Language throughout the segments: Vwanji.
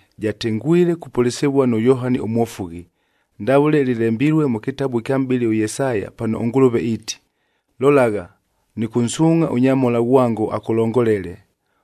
jatengwile kupʉlɨsɨvua nʉ Yohani ʉMwofughi, ndavʉle lɨlembilue mʉ kɨtabu ɨkya mʼbɨli ʉYesaya pano ʉNgʉlʉve iiti, “Lolagha, nɨkʉnsuungʼha ʉnyamhola ghwango akʉlongolele,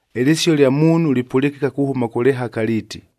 “Ɨlɨsio lya muunhu lipʉlɨkɨka kuhʉma kʉ lɨhaka liiti,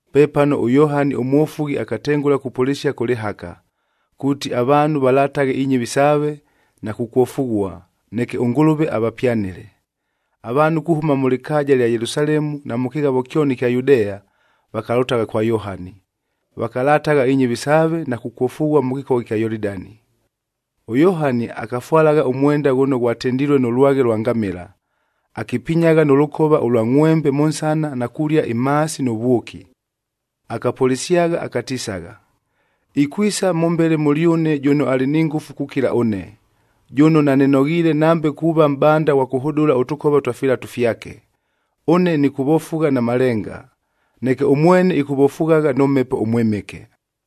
Pepano ʉYohani ʉMwofughi akatengʉla kupʉlɨsia kʉ lɨhaka, kuuti avaanhu valataghe inyɨvi saave na kukwofughua, neke ʉNgʉlʉve avapyanɨle. Avaanhu kuhʉma mʉ lɨkaaja ɨlya Yelusalemu na mʉ kɨghavo kyoni ɨkya Yudea, vakalʉtagha kwa Yohani, vakalatagha inyɨvi saave, na kukwofughua mʉ kɨkogha ɨkya Yolidani. ɄYohani akafwalagha ʉmwenda ghʉno ghwatendilue nʉ lwaghe lwa ngamɨla,e akipinyagha nʉ lʉkova ʉlwa ngʼhwembe mʉ nsana na kulia imhaasi nʉ vwʉki. Akapʉlɨsyagha akatisagha, “Ikwisa mʉmbele mʉlyʉne jʉno alɨ ni ngʉfu kukila ʉne, jʉno nanɨnoghiile nambe kuuva mʼbanda ghwa kʉhʉdʉla ʉtʉkova twa filatu fyake. Ʉne nɨkʉvofugha na malenga, neke ʉmwene ɨkʉvofughagha nʉ Mhepo ʉMwɨmɨke.”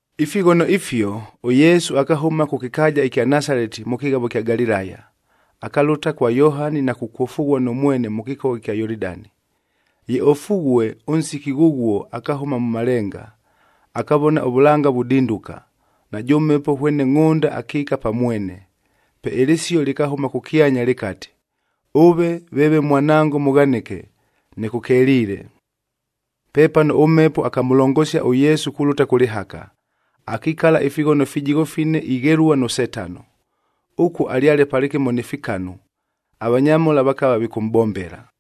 Ifighono ifio, ʉYesu akahʉma kʉ kɨkaaja ɨkya Nasaleti mʉ kɨghavof ɨkya Galilaya, akalʉta kwa Yohani na kukwofughua nʉ mwene mʉ kɨkogha ɨkya Yolidani. Ye ofughue, ʉnsiki ghʉghuo akahʉma mʉ malenga, akavona ʉvʉlanga vudinduka, najʉ Mhepo hwene ngʼhʉnda akiika pa mwene. Pe ɨlɨsio lɨkahʉma kʉkyanya lɨkati, “Ʉve veeve Mwanango mʉghanɨke, nɨkʉkeliile.” Pepano ʉMhepo akamʉlongosia ʉYesu kulʉta kʉ lɨhaka, akikala ifighono fijigho fine ighelua nʉ Setano. Ʉkuo alyale palɨkɨmo ni fikanu, avanyamhola vakava vikʉmʼbombela.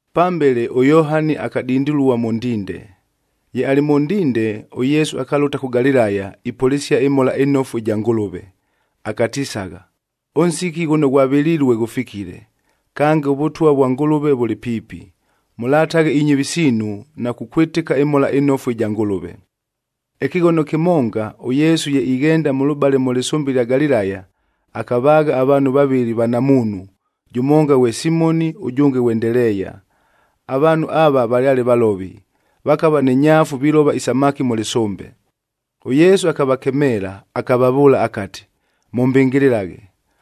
Pambele ʉYohani akadindilua mʉ ndinde. Ye alɨ mʉ ndinde, ʉYesu akalʉta kʉ Galilaya ipʉlɨsia ɨMhola ɨNofu ɨja Ngʉlʉve, akatisagha, “Ʉnsiki ghʉno ghwavɨlilue ghʉfikile, kange ʉVʉtwa vwa Ngʉlʉve vʉlɨ piipi, mʉlataghe inyɨvi siinu na kukwɨtɨka ɨMhola ɨNofu ɨja Ngʉlʉve.” Ɨkɨghono kɨmonga, ʉYesu ye ighenda mʉlʉbale mʉ lɨsʉmbe ɨlya Galilaya, akavaagha avaanhu vavɨlɨ vanamuunhu, jʉmonga ghwe Simoni ʉjʉnge ghwe Ndeleeya. Avaanhu ava valyale valovi, vakava ni nyaafu vilova isamaki mʉ lɨsʉmbe. ɄYesu akavakemeela akavavʉʉla akati, “Mʉmbɨngɨlɨlaghe!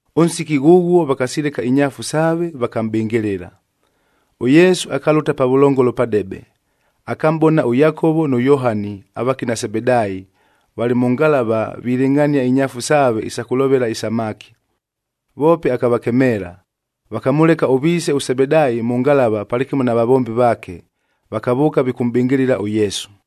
Ʉnsiki ghʉghuo vakasileka inyaafu saave, vakamʼbɨngɨlɨla. ɄYesu akalʉta pavʉlongolo padebe, akamʼbona ʉYakovo nʉ Yohani avakina Sebedaayi valɨ mʉ ngalavah vilɨngʼhania inyaafu saave isa kʉlovela isamaki. Voope akavakemeela, vakamʉleka ʉviise ʉSebedaayi mʉ ngalava palɨkɨmo na vavombi vaake, vakavʉʉka vikʉmʼbɨngɨlɨla ʉYesu.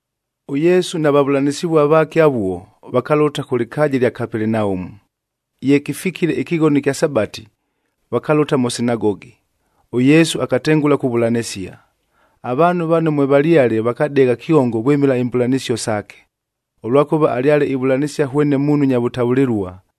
ɄYesu na vavʉlanɨsɨvua vaake avuo,i vakalʉta kʉ lɨkaaja ɨlya Kapelenaumu. Ye kɨfikile ɨkɨghono ɨkya Sabati,j vakalʉta mʉ sinagogi,k ʉYesu akatengʉla kuvʉlanɨsia. Avaanhu vano mwevalyale vakadegha kyongo vwɨmɨla imbʉlanɨsio saake, ʉlwakʉva alyale ivʉlanɨsia hwene muunhu nya vʉtavʉlɨlua,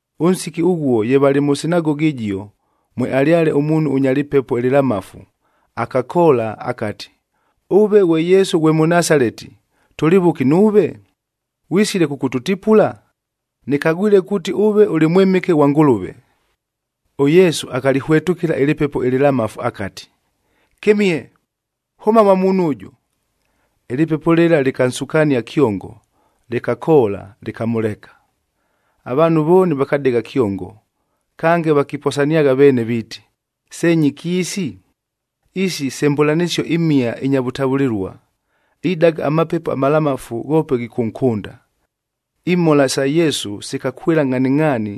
Ʉnsiki ghʉghuo ye valɨ mʉ sinagogi ɨjio, mwealyale ʉmuunhu ʉnya lɨpepo ɨlɨlamafu, akati, “Ʉve ghwe Yesu ghwe Mʉnasaleti, tʉlɨ vʉki nuuve? Ghwisile kʉkʉtʉtipula? Nɨkagwile kuuti ʉve ʉlɨ Mwɨmɨke ghwa Ngʉlʉve.” ɄYesu akalɨhwetʉkɨla ɨlɨpepo ɨlɨlamafu akati, “Kɨmihe! Hʉma mwa muunhu ʉjʉ!” Ɨlɨpepo lɨla lɨkansukania kyongo, lɨkakoola, lɨkamʉleka. Avaanhu vooni vakadegha kyongo, kange vakiposaniagha veene viiti, “Se nyɨki isi? Isi se mbʉlanɨsio imhia inya vʉtavʉlɨlua! Idaga amapepo amalamafu ghoope ghikʉnkʉnda!” Imhola sa Yesu sikakwɨla ngʼhaningʼhaani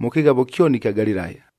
mʉ kɨghavo kyoni ɨkya Galilaya.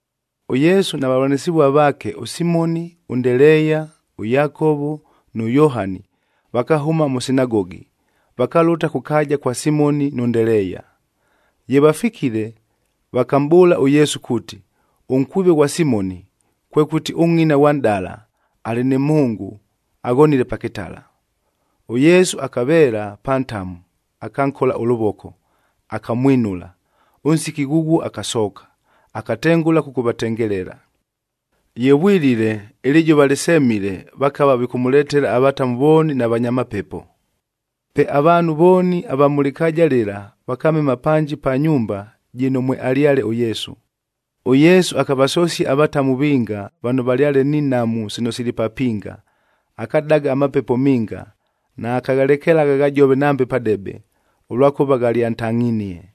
ɄYesu na vavʉlanɨsɨvua vaake ʉSimoni, ʉNdeleeya, ʉYakovo nʉ Yohani vakahʉma mʉ sinagogi, vakalʉta kʉ kaaja kwa Simoni nʉ Ndeleeya. Ye vafikile, vakamʼbʉʉla ʉYesu kuuti, ʉnkwive ghwa Simoni, kwekʉti ʉngʼina ghwa nʼdala, alɨ nɨ mhʉngʉ aghonile pa kɨtala. ɄYesu akaveela pa ntamu akankola ʉlʉvoko, akamwinula. Ʉnsiki ghʉghuo akasooka, akatengʉla kʉkʉvatengelela. Ye vwilile, ɨlɨjʉva lɨsemile vakava vikʉmʉletela avatamu vooni na vanya mapepo. Pe avaanhu vooni, ava mʉ lɨkaaja lɨla vakamema panji pa nyumba jɨno mwealyale ʉYesu. ɄYesu akavasosia avatamu vinga, vano valyale ni nhamu sino sili papinga. Akadaga amapepo minga, naakaghalekelagha ghajove nambe padebe, ʉlwakʉva ghalyantangʼhinie.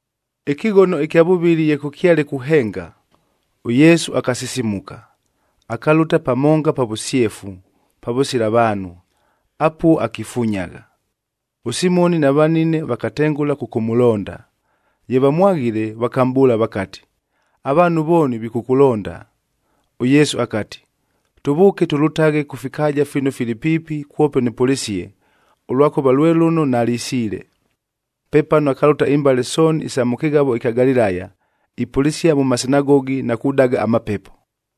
Ɨkɨghono ɨkya vʉvɨlɨ ye kʉkyale kuhenga, ʉYesu akasisimuka, akalʉta pamonga pa vʉsyefu, pavʉsila vaanhu, apuo akifunyagha. ɄSimoni na vanine vakatengʉla kʉkʉmʉlonda. Ye vamwaghile, vakamʼbʉʉla vakati, “Avaanhu vooni vikʉkʉlonda.” ɄYesu akati, “Tʉvʉʉke tʉlʉtaghe kʉ fikaaja fino fili piipi kwope nɨpʉlɨsie, ʉlwakʉva lwe lʉno nalisiile.” Pepano akalʉta imbale sooni isa mʉ kɨghavo ɨkya Galilaya, ipʉlɨsia mʉ masinagogi na kudaga amapepo.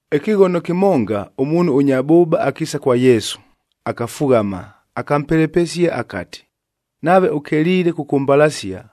Ɨkɨghono kɨmonga, ʉmuunhu ʉnya bʉʉba akiisa kwa Yesu, akafughama, akampelepesia akati, “Nave ʉkeliile kʉkʉmbalasia,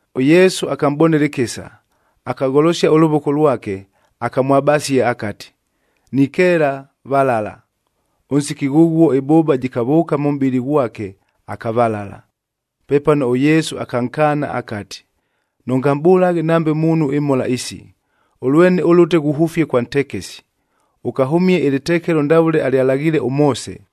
ɄYesu akamʼbonela ɨkɨsa, akagholosia ʉlʉvoko lwake, akamwabasia akati, “Nikeela, valala.” Ʉnsiki ghʉghuo ɨbʉʉba jɨkavʉʉka mʉ mʼbɨlɨ ghwake, akavalala. Pepano ʉYesu akankaana akati, “Nʉngamʼbʉlaghe nambe muunhu imhola isi! Ʉlwene ʉlʉte ghuhʉfie kwa ntekesi,n ʉkahʉmie ɨlɨtekelo ndavʉle alyalaghiile ʉMoose,